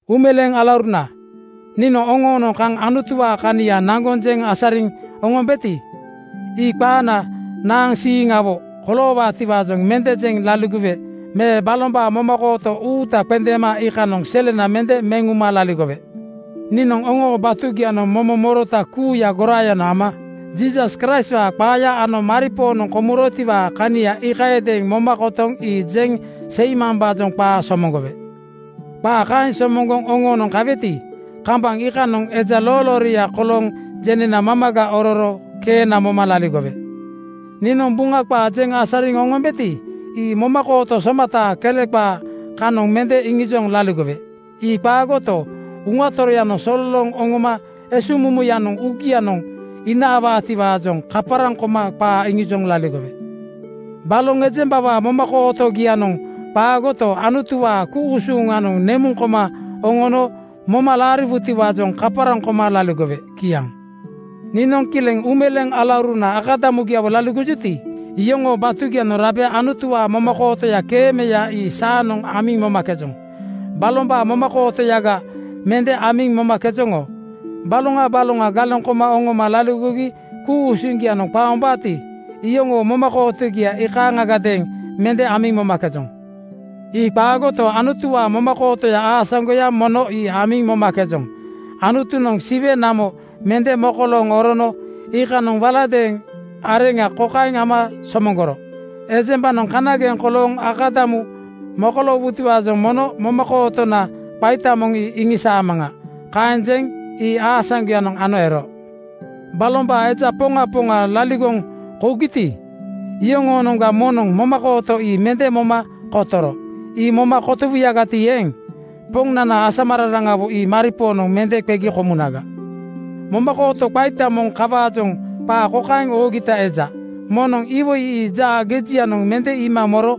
Uumeleeŋ alauruna, niinoŋ oŋoonoŋ kaŋ Anutuwaa kania naŋgoŋ jeŋ asariŋ oŋombeti, ii qaana naaŋ siiŋsiiŋawo koloowaatiwaajoŋ mende jeŋ laligowe me balombaa momakooto uuta qendeema iikanoŋ selena mende meŋ uma laligowe. Niinoŋ oŋoo batugianoŋ momo morota kuuya goraayanoŋ ama Jiisas Kraistwaa qaaya ano maripoonoŋ komurotiwaa kania iikayadeeŋ moma kotoŋ ii jeŋ seimambaajoŋ qaa somoŋgowe. Qaa kaeŋ somoŋgoŋ oŋoonoŋ kaweti, kambaŋ iikanoŋ eja loolooria kolooŋ jenena mamaga ororo keena moma laligowe. Niinoŋ Buŋa qaa jeŋ asariŋ oŋombeti, ii momakooto somataa kele qaa kanoŋ mende iŋijoŋ laligowe. Ii qaagoto, Uŋa Toroyanoŋ sololooŋ oŋono esuŋmumuyanoŋ uugianoŋ inaawaatiwaajoŋ kaparaŋ koma qaa iŋijoŋ laligowe. Baloŋ ejembawaa momakootogianoŋ qaagoto, Anutuwaa ku-usuŋanoŋ nemuŋ koma oŋono moma laariwutiwaajoŋ kaparaŋ koma laligowe. Kiaŋ. Niinoŋ kileŋ uumeleeŋ alauruna akadamugiawo laligojuti, iyoŋoo batugianoŋ rabe Anutuwaa momakootoya keemeya ii saanoŋ amiŋ momakejoŋ. Balombaa momakootoyaga mende amiŋ momakejoŋ. Baloŋa baloŋa galeŋ koma oŋoma laligogi ku-usuŋgianoŋ qaombaati, iyoŋoo momakootogia ii kaaŋagadeeŋ mende amiŋ momakejoŋ. Ii qaagoto, Anutuwaa momakooto aasaŋgoya mono ii amiŋ momakejoŋ. Anutunoŋ Siwe namo mende mokolooŋ orono iikanoŋ waladeeŋ areŋa kokaeŋ ama somoŋgoro, “Ejembanoŋ kanageŋ kolooŋ akadamu mokoloowutiwaajoŋ mono momakootona qaita moŋ ii iŋisaamaŋa.” Kaeŋ jeŋ ii aasaŋgoyanoŋ ano ero. Balombaa eja poŋa poŋa laligoŋ kougiti, iyoŋoonoŋga moŋnoŋ momakooto ii mende moma kotoro. Ii moma kotowuyagati eeŋ, Poŋnana asamararaŋawo ii maripoonoŋ mende qegi komunaga. Momakooto qaita moŋ kawaajoŋ qaa kokaeŋ oogita eja, “Moŋnoŋ iwoi ii jaa gejianoŋ mende iima moro.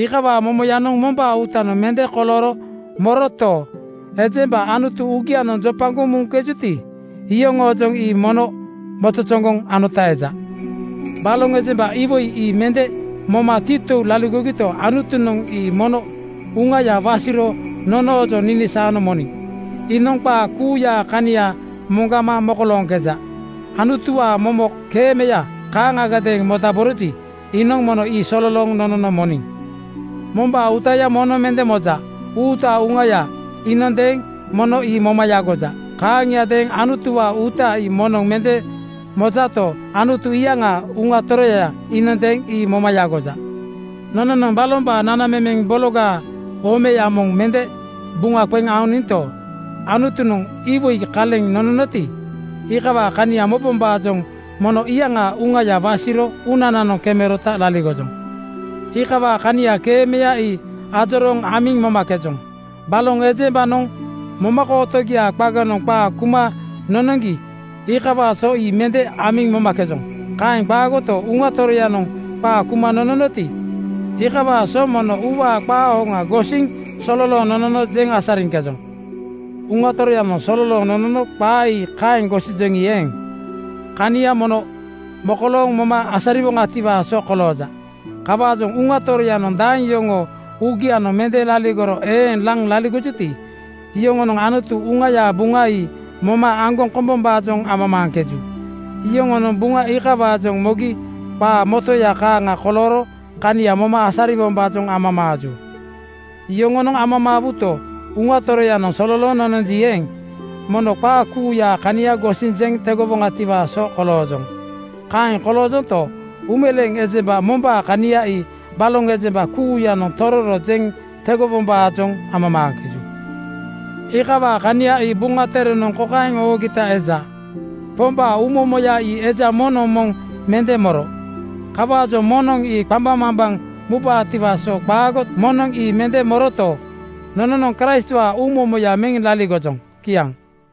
Iikawaa momoyanoŋ mombaa uutanoŋ mende kolooro moroto, ejemba Anutu uugianoŋ jopagoŋ muŋkejuti, iyoŋoojoŋ ii mono mozozoŋgoŋ anota eja.” Baloŋ ejemba iwoi ii mende moma titou laligogito, Anutunoŋ ii mono Uŋaya wasiro nonoojoŋ ninisaano moniŋ. Iinoŋ qaa kuuyaa kania moŋgama mokolooŋkeja. Anutuwaa momo keemeya kaaŋagadeeŋ modaboroji, iinoŋ mono ii sololooŋ nonono moniŋ. Mombaa uuta moŋnoŋ mende moja. Uutaa uŋaya iinondeeŋ mono ii moma yagoja. Kaaŋiadeeŋ Anutuwaa uuta ii moŋnoŋ mende mojato, Anutu iyaŋaa Uŋa Toroya iinondeeŋ ii moma yagoja. Nononoŋ balombaa nanamemeŋ bologaa omeya moŋ mende buŋa qeŋ aoninto, Anutunoŋ iwoi kaleŋ nononoti, iikawaa kania mobombaajoŋ mono iyaŋaa Uŋaya wasiro uunananoŋ kemerota laligojoŋ. Iikawaa kania keemeya ii ajorooŋ amiŋ momakejoŋ. Baloŋ ejembanoŋ momakootogiaa qaganoŋ qaa kuma nonoŋgi iikawaa so ii mende amiŋ momakejoŋ. Kaeŋ qaagoto, Uŋa Toroyanoŋ qaa kuma nononoti, iikawaa so mono uuwaa qaa hoŋa gosiniŋ sololooŋ nonono jeŋ asariŋkejoŋ. Uŋa Toroyanoŋ sololooŋ nonono qaa ii kaeŋ gosijoŋi eeŋ, kania mono mokolooŋ moma asariwoŋatiwaa so kolooja. Kawaajoŋ Uŋa Toroyanoŋ daeŋ yoŋoo uugianoŋ mende laligoro eeŋ laŋ laligojuti, iyoŋonoŋ Anutu Uŋayaa buŋa ii moma aŋgoŋ kombombaajoŋ amamaaŋkeju. Yoŋonoŋ Buŋa iikawaajoŋ mogi qaa motoya kaaŋa kolooro kania moma asariwombaajoŋ amamaaju. Yoŋonoŋ amamaajuto, Uŋa Toroyanoŋ sololooŋ nononji eeŋ, mono qaa kuuyaa kania gosiŋ jeŋ tegowoŋatiwaa so koloojoŋ. Kaeŋ koloojonto, uumeleeŋ ejemba mombaa kania ii baloŋ ejemba kuuyanoŋ tororo jeŋ tegowombaajoŋ amamaaŋkeju. Iikawaa kania ii Buŋa Terenoŋ kokaeŋ oogita eja, “Pombaa uumomoya ii eja moŋnoŋ moŋ mende moro. Kawaajoŋ moŋnoŋ ii qambaŋmambaŋ mubaatiwaa so qaago.” Moŋnoŋ ii mende moroto, nononoŋ Kraistwaa uumomoya meŋ laligojoŋ. Kiaŋ.